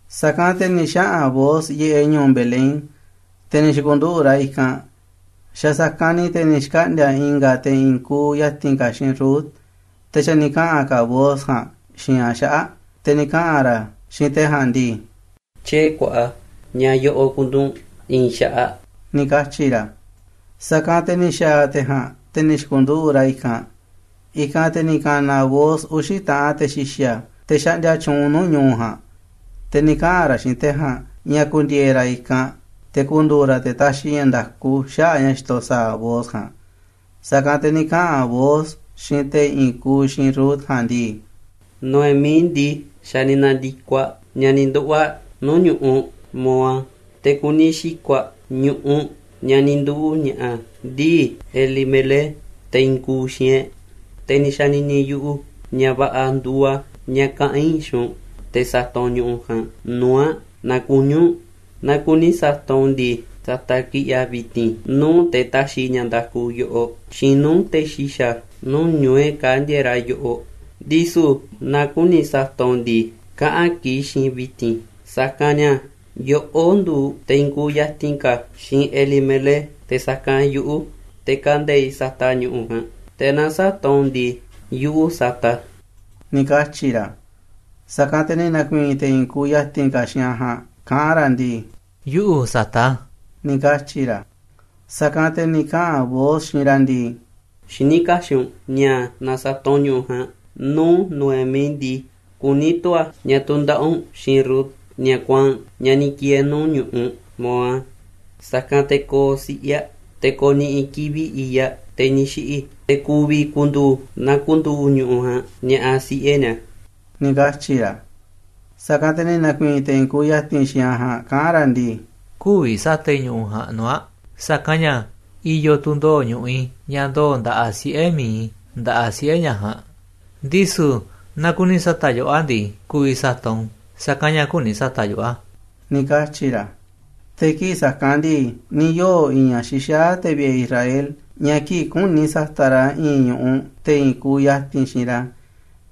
Sa̱kanꞌ te̱ ni̱ xaꞌa̱n Booz yiꞌeꞌ ñu̱u̱ Belén, te̱ ni̱ xi̱ku̱nduꞌu̱ꞌ ra̱ i̱kanꞌ. Xa̱ sa̱kanꞌ ni̱ te̱ ni̱ xkaꞌndi̱a̱ i̱nga̱ te̱ i̱i̱n kuuꞌ ya̱ti̱n ka̱ xiinꞌ Rut, te̱ xa̱ ni̱ kaꞌa̱n ka̱ Booz ja̱a̱nꞌ xiinꞌ aꞌ xaꞌa̱ꞌ. Te̱ ni̱ kaꞌa̱n ra̱ xiinꞌ te̱ ja̱a̱nꞌ ndii: ―Tyiee̱ kuaꞌa, ni̱a̱ꞌa̱ yoꞌoꞌ ku̱nduꞌu̱ꞌ u̱nꞌ i̱i̱n xaꞌaꞌ ―ni̱ katyi̱ ra̱. Sa̱kanꞌ te̱ ni̱ xa̱a̱ te̱ ja̱a̱nꞌ, te̱ ni̱ xi̱ku̱nduꞌu̱ꞌ ra̱ i̱kanꞌ. I̱kanꞌ te̱ ni̱ ka̱na̱ Booz uxi̱ taꞌanꞌ te̱ xi̱xa̱, te̱ xaꞌndia tyuunꞌ nuu̱ꞌ ñu̱u̱ ja̱a̱nꞌ. Te̱ ni̱ kaꞌa̱n ra̱ xiinꞌ te̱ ja̱a̱nꞌ ña̱ ku̱ndi̱e̱e̱ ra̱ i̱kanꞌ te̱ ku̱ndu̱u̱ ra̱ te̱ ta̱xi̱ ña̱ nda̱ku xaꞌa̱ꞌ ña̱ xitoꞌ sa̱a̱ Booz ja̱a̱nꞌ. Sa̱kanꞌ te̱ ni̱ kaꞌa̱n Booz xiinꞌ te̱ i̱i̱n kuuꞌ xiinꞌ Rut ja̱a̱nꞌ ndii: ―Noemí ndii, xa̱ ni̱ na̱ndi̱koꞌ aꞌ ña̱ ni̱ nduꞌu̱ꞌ aꞌ nuu̱ꞌ ñu̱ꞌuꞌ Moab, te̱ kuni xi̱ko̱ꞌ aꞌ ñu̱ꞌuꞌ ña̱ ni̱ nduu̱ ña̱ꞌa̱ ndii̱ Elimelec, te̱ i̱i̱n kuuꞌ xiinꞌ e̱ꞌ. Te̱ ni̱ xa̱ni̱ni̱ yuꞌu̱ ña̱ va̱ꞌa̱ nduuꞌ a̱ ña̱ kaꞌa̱n i̱ xiinꞌ u̱nꞌ te̱ sa̱ta̱ꞌ u̱nꞌ ñu̱ꞌuꞌ ja̱a̱nꞌ nuu̱ꞌ aꞌ naaꞌ kuní u̱nꞌ. Naaꞌ kuni sa̱ta̱ꞌ u̱nꞌ u̱n ndii, sa̱ta̱ꞌ kiꞌi̱ꞌ a̱ vi̱ti̱n nuu̱ꞌ te̱ ta̱xi̱ ña̱ nda̱ku yoꞌoꞌ, xiinꞌ nuu̱ꞌ te̱ xi̱xa̱ nuu̱ꞌ ñu̱u̱ e̱ꞌ kaa̱ꞌ ndieeꞌ ra̱ yoꞌoꞌ. Ndisu̱ naaꞌ küni sa̱ta̱ꞌ u̱nꞌ u̱n ndii, kaꞌa̱n kiꞌi̱ꞌ xiinꞌ i̱ vi̱ti̱n. Sa̱kanꞌ ña̱ yoꞌó nduuꞌ te̱ i̱i̱n kuuꞌ ya̱ti̱n ka̱ xiinꞌ Elimelec te̱ sa̱kanꞌ yuꞌu̱, te̱ kande̱iꞌ sa̱ta̱ꞌ ñu̱ꞌuꞌ ja̱a̱nꞌ. Te̱ naaꞌ sä̱ta̱ꞌ u̱nꞌ u̱n ndii, yuꞌu̱ sa̱ta̱ꞌ a̱ ―ni̱ katyi̱ ra̱. Sa̱kanꞌ te̱ ni̱ na̱ku̱i̱i̱n te̱ i̱i̱n kuuꞌ ya̱ti̱n ka̱ xiinꞌ aꞌ ja̱a̱nꞌ kaꞌán ra̱ ndii: ―Yuꞌu̱ sa̱ta̱ꞌ a̱ ―ni̱ katyi̱ ra̱. Sa̱kanꞌ te̱ ni̱ kaꞌa̱n Booz xiinꞌ ra̱ ndii: ―Xiní kaxiꞌ u̱nꞌ ña̱ naaꞌ sa̱ta̱ꞌ u̱nꞌ ñu̱ꞌuꞌ ja̱a̱nꞌ nuu̱ꞌ Noemí ndii, kuní tu̱ a̱ ña̱ tu̱ndaꞌa̱ꞌ u̱nꞌ xiinꞌ Rut, ñaꞌ kuaa̱nꞌ, ñaꞌ ni̱ ki̱e̱e̱ nuu̱ꞌ ñu̱ꞌuꞌ Moab. Sa̱kanꞌ te̱ ko̱o̱ siꞌe̱ aꞌ, te̱ ko̱ni̱ꞌi̱ kivi̱ꞌ i̱i̱ꞌ aꞌ, te̱ ni̱ xiꞌi̱, te̱ ku̱vi̱ ku̱ndu̱u̱ na ku̱ndu̱u̱ ñu̱ꞌuꞌ ja̱a̱nꞌ ña̱ꞌa̱ siꞌe̱ ni̱a̱ ―ni̱ katyi̱ ra̱. Sa̱kanꞌ te̱ ni̱ na̱ku̱i̱i̱n te̱ i̱i̱n kuuꞌ ya̱ti̱n xiinꞌ aꞌ ja̱a̱nꞌ kaꞌán ra̱ ndii: ―Kü̱vi̱ sa̱ta̱ꞌ i̱ ñu̱ꞌuꞌ ja̱a̱nꞌ nuu̱ꞌ aꞌ, sa̱kanꞌ ña̱ i̱yo̱ tu̱ ndoo̱ꞌ ñu̱ꞌuꞌ i̱, ña̱ ndoo̱ꞌ nda̱ꞌaꞌ siꞌe̱ mi̱iꞌ i̱ nda̱ꞌaꞌ siꞌe̱ ñaꞌ ja̱a̱nꞌ. Ndisu̱ naaꞌ kuni sa̱ta̱ꞌ yoꞌó a̱ ndii, ku̱vi̱ sa̱ta̱ꞌ u̱nꞌ, sa̱kanꞌ ña̱ küni sa̱ta̱ꞌ yuꞌu̱ a̱ ―ni̱ katyi̱ ra̱. Te̱ kii̱ꞌ sa̱kanꞌ ndii, ni̱ yoo̱ i̱i̱n ña̱ xixaá te̱ vi̱ꞌe̱ Israel, ña̱ kii̱ꞌ küni sa̱ta̱ꞌ ra̱ i̱i̱n ñu̱ꞌuꞌ te̱ i̱i̱n kuuꞌ ya̱ti̱n xiinꞌ ra̱,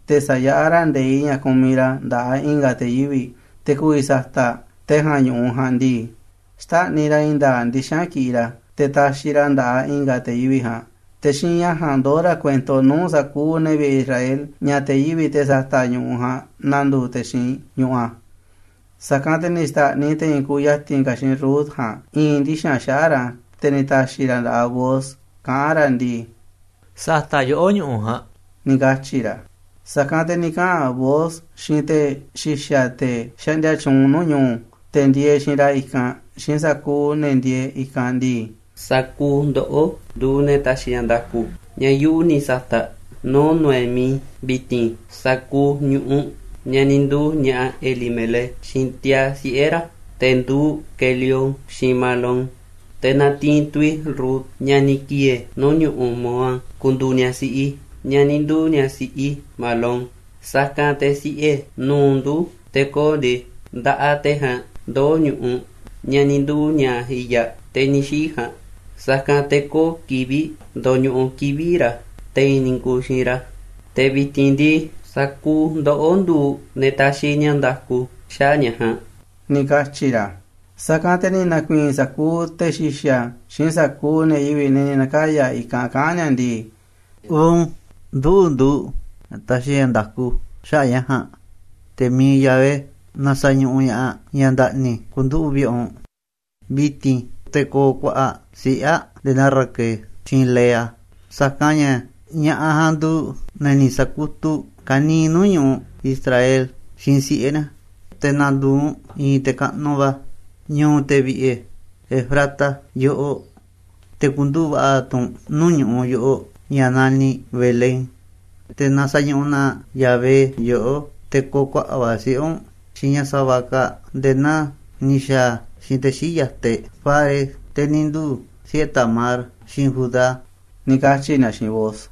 te̱ sayaꞌá ra̱ nde̱iꞌ ña̱ kumiꞌ ra̱ nda̱ꞌaꞌ i̱nga̱ te̱ yivi̱ꞌ, te̱ ku̱vi̱ sa̱ta̱ꞌ te̱ ja̱a̱nꞌ ñu̱ꞌuꞌ ja̱a̱nꞌ ndii, xtáꞌniꞌ ra̱ i̱i̱n nda̱a̱ꞌ ndixa̱nꞌ kiꞌiꞌ ra̱, te̱ taxiꞌ ra̱ a̱ nda̱ꞌaꞌ i̱nga̱ te̱ yivi̱ꞌ ja̱a̱nꞌ. Te̱ xiinꞌ ña̱ ja̱a̱nꞌ ndoó ra̱ kuento nuu̱ꞌ sa̱kuuꞌ ne̱ Israel ña̱ te̱ yivi̱ꞌ, te̱ sata̱ꞌ ñu̱ꞌuꞌ ja̱a̱nꞌ, nanduuꞌ te̱ xiinꞌ ñu̱ꞌuꞌ a̱. Sa̱kanꞌ te̱ ni̱ xta̱ꞌniꞌ te̱ i̱i̱n kuuꞌ ya̱ti̱n ka̱ xiinꞌ Rut ja̱a̱nꞌ i̱i̱n ndixa̱nꞌ xaꞌa̱ꞌ ra̱, te̱ ni̱ ta̱xi̱ ra̱ a̱ nda̱ꞌaꞌ Booz kaꞌán ra̱ ndii: ―Sa̱ta̱ꞌ yoꞌó ñu̱ꞌuꞌ ja̱a̱nꞌ ―ni̱ katyi̱ ra̱. Sa̱kanꞌ te̱ ni̱ kaꞌa̱n Booz xiinꞌ te̱ xi̱xa̱, te̱ xaꞌndia tyuunꞌ nuu̱ꞌ ñu̱u̱, te̱ ndieeꞌ xiinꞌ ra̱ i̱kanꞌ, xiinꞌ sa̱kuuꞌ ne̱ ndieeꞌ i̱kanꞌ ndii: ―Sa̱kuuꞌ ndoꞌó nduuꞌ ne̱ taxiꞌ ña̱ nda̱ku ña̱ yuꞌu̱ ni̱ sa̱ta̱ꞌ nuu̱ꞌ Noemí vi̱ti̱n sa̱kuuꞌ ñu̱ꞌuꞌ ña̱ ni̱ nduu̱ ña̱ꞌa̱ Elimelec xiinꞌ tiaa̱ siꞌe̱ ra̱, te̱ nduuꞌ Quelión, xiinꞌ Mahlón. Te̱ natiinꞌ tu̱ i̱ Rut, ñaꞌ ni̱ ki̱e̱e̱ nuu̱ꞌ ñu̱ꞌuꞌ Moab, ku̱ndu̱u̱ ñaꞌ siꞌi i̱, ñaꞌ ni̱ nduu̱ ñaꞌ siꞌi Mahlón. Sa̱kanꞌ te̱ siꞌe̱ nu̱uꞌ ndu̱ te̱ ko̱o̱ ndii, nda̱ꞌaꞌ te̱ ja̱a̱nꞌ ndoo̱ꞌ ñu̱ꞌuꞌ ña̱ ni̱ nduu̱ ña̱ꞌa̱ i̱i̱ꞌ aꞌ, te̱ ni̱ xiꞌi̱ ja̱a̱nꞌ. Sa̱kanꞌ te̱ köo̱ꞌ kivi̱ꞌ ndo̱ñuꞌuꞌ kivi̱ꞌ ra̱ te̱i̱n ne̱ i̱i̱n kuuꞌ xiinꞌ ra̱. Te̱ vi̱ti̱n ndii, sa̱kuuꞌ ndoꞌó nduuꞌ ne̱ taxiꞌ ña̱ nda̱ku xaꞌa̱ꞌ ña̱ ja̱a̱nꞌ ―ni̱ katyi̱ ra̱. Sa̱kanꞌ te̱ ni̱ na̱ku̱i̱i̱n sa̱kuuꞌ te̱ xi̱xa̱ xiinꞌ sa̱kuuꞌ ne̱ yivi̱ꞌ, ne̱ ni̱ na̱kaya̱ i̱kanꞌ, kaꞌán ni̱a̱ ndii: ―Uun, nduꞌu̱ nduuꞌ ne̱ taxiꞌ ña̱ nda̱ku xaꞌa̱ꞌ ña̱ ja̱a̱nꞌ. Te̱ mi̱iꞌ Yahvé na sa̱ñuꞌuꞌ ña̱ꞌaꞌ, ñaꞌ nda̱ꞌni̱ ku̱nduꞌu̱ꞌ vi̱ꞌe̱ u̱nꞌ vi̱ti̱n. Te̱ ko̱o̱ kuaꞌa̱ꞌ siꞌe̱ aꞌ nde̱e̱ naa Raquel xiinꞌ Lea, sa̱kanꞌ ña̱ ña̱ꞌaꞌ ja̱a̱nꞌ nduuꞌ ne̱ ni̱ sa̱kutuꞌ ka̱niiꞌ nuu̱ꞌ ñu̱ꞌuꞌ Israel xiinꞌ siꞌe̱ ni̱a̱. Te̱ na̱ndu̱u̱ u̱nꞌ i̱i̱n te̱ kaꞌnuꞌ va̱ ñu̱u̱ te̱ vi̱ꞌe̱ Efrata yoꞌoꞌ, te̱ ku̱nduꞌu̱ꞌ va̱ꞌa̱ tu̱ u̱nꞌ nuu̱ꞌ ñu̱ꞌuꞌ yoꞌoꞌ, ña̱ naniꞌ Belén. Te̱ na sa̱ñuꞌuꞌ na Yahvé yoꞌó, te̱ ko̱o̱ kuaꞌa̱ꞌ va̱ siꞌe̱ u̱nꞌ xiinꞌ ñaꞌ sa̱va̱ kaa̱ꞌ nde̱e̱ naa ni̱ xa̱a̱ a̱ xiinꞌ te̱ xii̱ꞌ yataꞌ e̱ꞌ Fares, te̱ ni̱ nduu̱ siꞌe̱ Tamar xiinꞌ Judá ―ni̱ katyi̱ ni̱a̱ xiinꞌ Booz.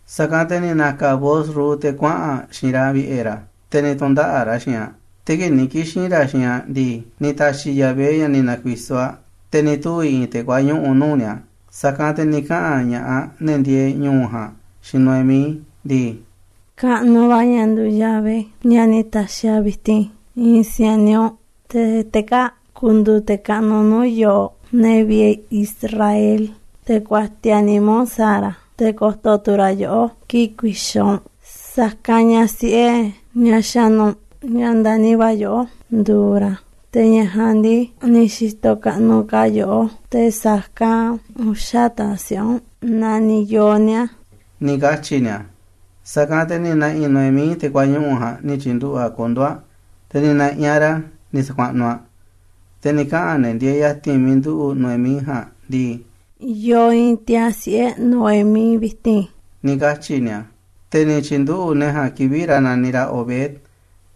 Sa̱kanꞌ te̱ ni̱ na̱ka̱ Booz Rut, te̱ kuaꞌa̱n aꞌ xiinꞌ ra̱ vi̱ꞌe̱ ra̱, te̱ ni̱ tu̱ndaꞌa̱ꞌ ra̱ xiinꞌ aꞌ. Te̱ kii̱ꞌ ni̱ kixi̱n ra̱ xiinꞌ aꞌ ndii, ni̱ ta̱xi̱ Yahvé ña̱ ni̱ na̱ku̱i̱so̱ aꞌ, te̱ ni̱ tuvi̱ i̱i̱n te̱ kuañuꞌu̱ nuu̱ꞌ ni̱a̱. Sa̱kanꞌ te̱ ni̱ kaꞌa̱n ña̱ꞌaꞌ, ne̱ ndieeꞌ ñu̱u̱ ja̱a̱nꞌ, xiinꞌ Noemí ndii: ―Kaꞌnuꞌ va̱ ña̱ nduuꞌ Yahvé, ña̱ ni̱ ta̱xi̱ a̱ vi̱ti̱n i̱i̱n si̱a̱niꞌ u̱nꞌ, te̱ te̱ kaa̱ꞌ ku̱ndu̱u̱ te̱ kaꞌnuꞌ nuu̱ꞌ yooꞌ, ne̱ vi̱ꞌe̱ Israel. Te̱ ku̱a̱tiaꞌ nimá u̱nꞌ sa̱a̱ ra̱, te̱ ko̱to̱ tu̱ ra̱ yoꞌó kii̱ꞌ ku̱i̱xa̱ u̱nꞌ, sa̱kanꞌ ña̱ siꞌe̱ ñaꞌ xa̱nu̱ u̱nꞌ, ña̱ ndani̱ va̱ yoꞌó, nduuꞌ ra̱. Te̱ ñaꞌ ja̱a̱nꞌ ndii, ni̱ xi̱to̱ kaꞌnuꞌ ka̱ aꞌ yoꞌó te̱ sa̱kanꞌ uxa̱ taꞌanꞌ siꞌe̱ u̱nꞌ, naaꞌ ni̱ yoo̱ ni̱a̱ ―ni̱ katyi̱ ni̱a̱. Sa̱kanꞌ te̱ ni̱ na̱ꞌi̱ Noemí te̱ kuañuꞌu̱ ja̱a̱nꞌ ni̱ tyi̱nduꞌu̱ꞌ aꞌ kondo̱ aꞌ, te̱ ni̱ na̱ꞌi̱ aꞌ ra̱ ni̱ sa̱kuaꞌnuꞌ aꞌ. Te̱ ni̱ kaꞌa̱n ne̱ ndieeꞌ ya̱ti̱n miiꞌ nduꞌu̱ꞌ Noemí ja̱a̱nꞌ ndii: ―Yoo i̱i̱n tiaa̱ siꞌe̱ Noemí vi̱ti̱n ―ni̱ katyi̱ ni̱a̱. Te̱ ni̱ tyi̱nduꞌu̱ꞌ ne̱ ja̱a̱nꞌ kivi̱ꞌ ra̱ naniꞌ ra̱ Obed.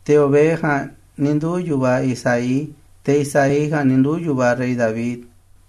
Te̱ Obed ja̱a̱nꞌ ni̱ nduu̱ yu̱vaꞌ Isaí, te̱ Isaí ja̱a̱nꞌ ni̱ nduu̱ yu̱vaꞌ rey David.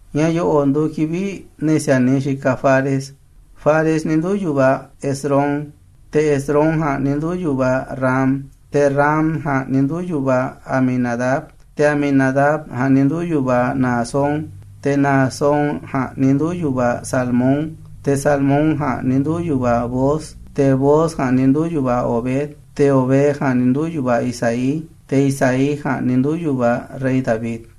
Ña̱ yo̱ꞌo̱ꞌ nduuꞌ kivi̱ꞌ ne̱ si̱a̱niꞌ xikaꞌ Fares: Fares ni̱ nduu̱ yu̱vaꞌ Hezrón, te̱ Hezrón ja̱a̱nꞌ ni̱ nduu̱ yu̱vaꞌ Ram, te̱ Ram ja̱a̱nꞌ ni̱ nduu̱ yu̱vaꞌ Aminadab, te̱ Aminadab ja̱a̱nꞌ ni̱ nduu̱ yu̱vaꞌ Naasón, te̱ Naasón ja̱a̱nꞌ ni̱ nduu̱ yu̱vaꞌ Salmón, te̱ Salmón ja̱a̱nꞌ ni̱ nduu̱ yu̱vaꞌ Booz, te̱ Booz ja̱a̱nꞌ ni̱ nduu̱ yu̱vaꞌ Obed, te̱ Obed ja̱a̱nꞌ ni̱ nduu̱ yu̱vaꞌ Isaí, te̱ Isaí ja̱a̱nꞌ ni̱ nduu̱ yu̱vaꞌ rey David.